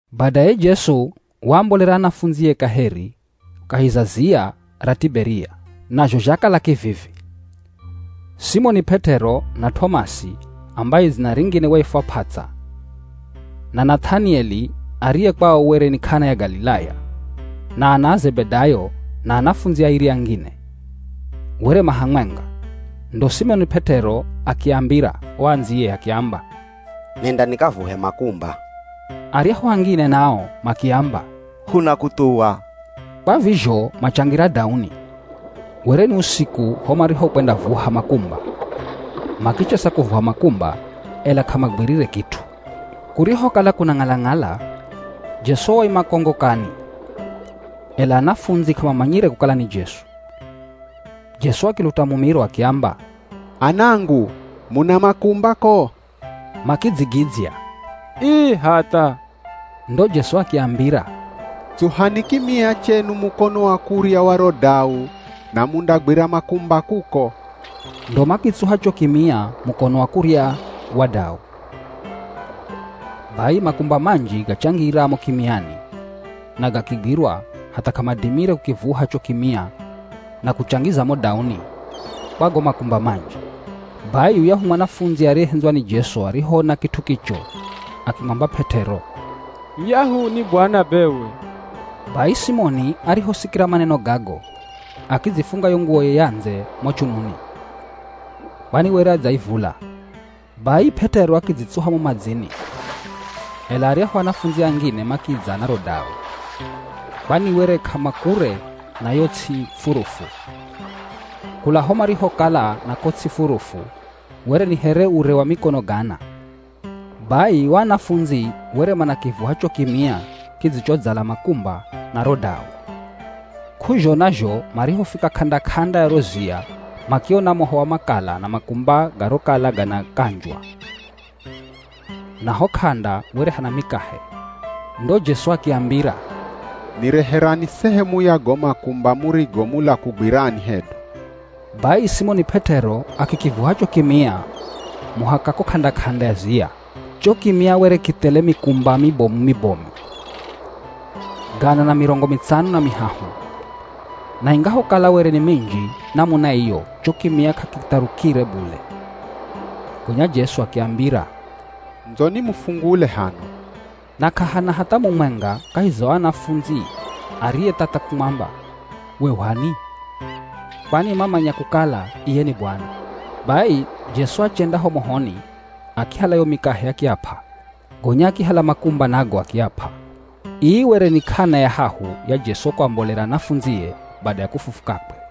Badaye Jesu waambolera anafundzie kaheri kahi za ziya ra Tiberia. Nazho zhakala kivivi: Simoni P'et'ero, na T'omasi ambaye dzina ringine waifwa P'ats'a, na Nath'anieli ariye kwao were ni K'ana ya Galilaya, na ana a Zebedayo na anafundzi airi angine, were ma hamwenga. Ndo Simoni P'et'ero akiambira o andziye akiamba, “Nenda nikavuhe makumba.” Aryahu angine nao makiamba, “Hunakuthuwa.” Kwa vizho machangira dauni. Were ni usiku ho marihokwendavuha makumba. Makichesa kuvuha makumba, ela k'amagwirire kit'u. Kurihokala kunang'ala-ng'ala, Jesu waima ko ngokani, ela anafundzi k'amamanyire kukala ni Jesu. Jesu akiluta mumiro akiamba, “Anangu, muna makumba ko?” Makidzigidzya, “Ii hatha!” Ndo Jesu akiambira, “Tsuhani kimia chenu mukono wa kurya wa ro dau na mundagwira makumba kuko.” Ndo makitsuha cho kimia mukono wa kurya wa dau. Bai makumba manji gachangira mo kimiani na gakigwirwa hatha k'amadimire kukivuha cho kimia na kuchangiza mo dauni kwa go makumba manji! Bai yuyahu mwanafundzi ariyehendzwa ni Jesu arihoona kit'u kicho, akimwamba P'et'ero, “Yuyahu ni Bwana bewe.” Bai Simoni arihosikira maneno gago, akidzifunga yo nguwoye ya ndze mo chununi, kwani were adzaivula. Bai P'et'ero akidzitsuha mo madzini, ela aryahu anafundzi angine makidza na ro dau, kwani were k'amakure na yo ts'i furufu, kula ho marihokala na ko ts'i furufu were ni here ure wa mikono gana. Bai o anafundzi were manakivuha cho kimia kidzichodzala makumba na ro dau. K'uzhona zho marihofika k'anda-k'anda ya ro ziya makiona moho wa makala na makumba garokala ganakanjwa, na ho k'anda were hana mikahe. Ndo Jesu akiambira, “Nireherani sehemu ya go makumba murigo mula kugwirani hedu.” Bai Simoni P'et'ero akikivuha cho kimia muhaka ko k'anda-k'anda ya ziya. Cho kimia were kithele mikumba mibomu-mibomu, gana na mirongo mitsano na mihahu; na ingahokala were ni minji namuna iyo cho kimia k'akitharukire bule. Gonya Jesu akiambira, “Ndzoni mufungule hano.” Na k'ahana hatha mumwenga kahi za o anafundzi ariyethatha kumwamba, “We u h'ani,” kwani mamanya kukala iye ni Bwana. Bai Jesu achenda ho mohoni, akihala yo mikahe akiap'a, gonya akihala makumba nago akiap'a. Ii were ni k'ana ya hahu ya Jesu kuambolera anafundzie bada ya kufufukakwe.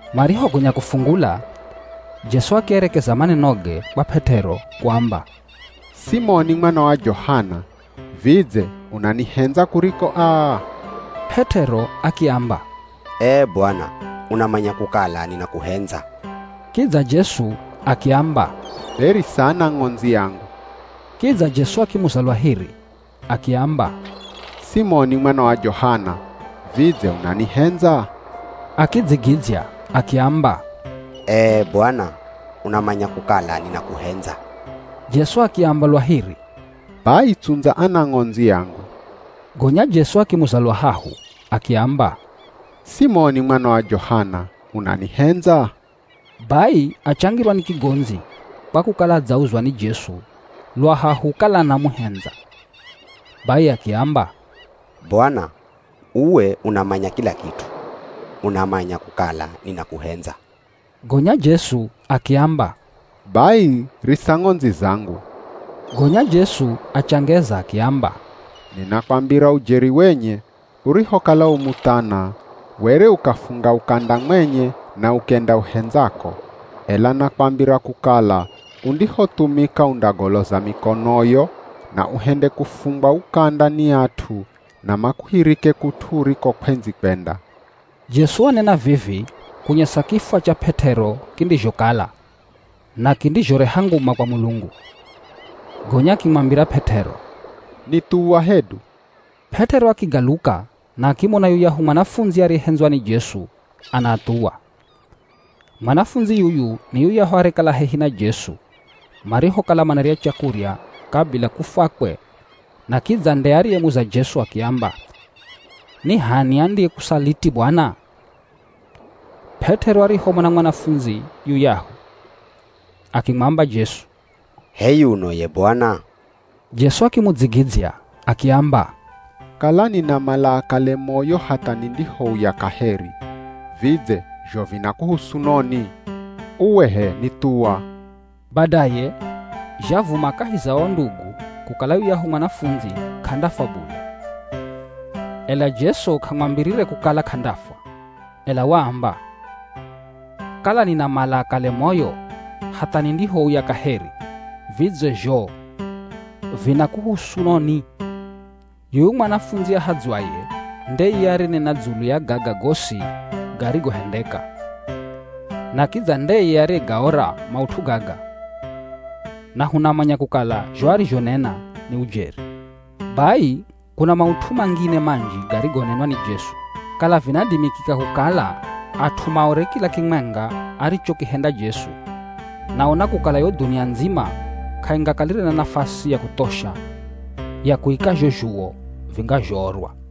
Marihogonya kufungula, Jesu akierekeza manenoge kwa P'et'ero kuamba, “Simoni mwana wa Johana, vidze unanihendza kuriko aa?” P'et'ero akiamba, “Ee Bwana! Unamanya kukala ninakuhendza.” Kidza Jesu akiamba, “Be risa anang'ondzi angu.” Kidza Jesu akimuza lwa hiri, akiamba, “Simoni mwana wa Johana, vidze unanihendza?” Akidzigidzya akiamba, “Ee Bwana, unamanya kukala ninakuhendza.” Jesu akiamba lwa hiri, “Bai tsundza anang'ondzi angu.” Gonya Jesu akimuza lwa hahu akiamba, “Simoni mwana wa Johana, unanihendza?” Bai achangirwa ni kigondzi kwa kukala adzauzwa ni Jesu lwa hahu kala anamuhendza. Bai akiamba, “Bwana uwe, unamanya kila kit'u. Unamanya kukala ninakuhendza” Gonya Jesu akiamba, “Bai risa ng'ondzi zangu.” Gonya Jesu achangeza akiamba, “Ninakwambira ujeri wenye urihokala u muthana, were ukafunga ukanda mwenye na ukenda uhendzako. Ela nakwambira kukala undihothumika undagoloza mikonoyo na uhende kufungwa ukanda ni at'u na makuhirike kut'u uriko kw'endzi kwenda.” Jesu wanena vivi kunyesa kifwa cha P'et'ero kindizhokala na kindizhoreha nguma kwa Mulungu. Gonya akimwambira P'et'ero, “Nithuwa hedu.” P'et'ero akigaluka na akimona yuyahu mwanafundzi ariyehendzwa ni Jesu anaathuwa. Mwanafundzi yuyu ni yuyahu ariyekala hehi na Jesu marihokala manarya chakurya kabila kufwakwe na kidza nde ariyemuza Jesu akiamba, “Ni h'ani andiyekusaliti Bwana?” P'et'ero arihomona mwanafundzi yuyahu akimwamba Jesu, “H'e yuno ye Bwana?” Jesu akimudzigidzya akiamba, “Kala ninamala akale moyo hatha nindihouya kaheri, vidze zho vinakuhusu noni? Uwe h'e nithuwa.” Badaye, zhavuma kahi za o ndugu kukala yuyahu mwanafundzi k'andafwa bule. Ela Jesu k'amwambire kukala k'andafwa, ela waamba, “Kala ninamala akale moyo hatha nindihouya kaheri, vidze zho vinakuhusu noni?” Yuyu mwanafundzi ahadzwaye nde iye ariyenena dzulu ya gaga gosi garigohendeka. Na kidza ndeye ariyegaora maut'u gaga na hunamanya kukala zho arizhonena ni ujeri. Bai kuna maut'u mangine manji garigonenwa ni Jesu. Kala vinadimikika kukala at'u maore kila kimwenga arichokihenda Jesu, naona kukala yo dhunia ndzima k'aingakalire na nafasi ya kuthosha ya kuika zho zhuwo vingazhoorwa.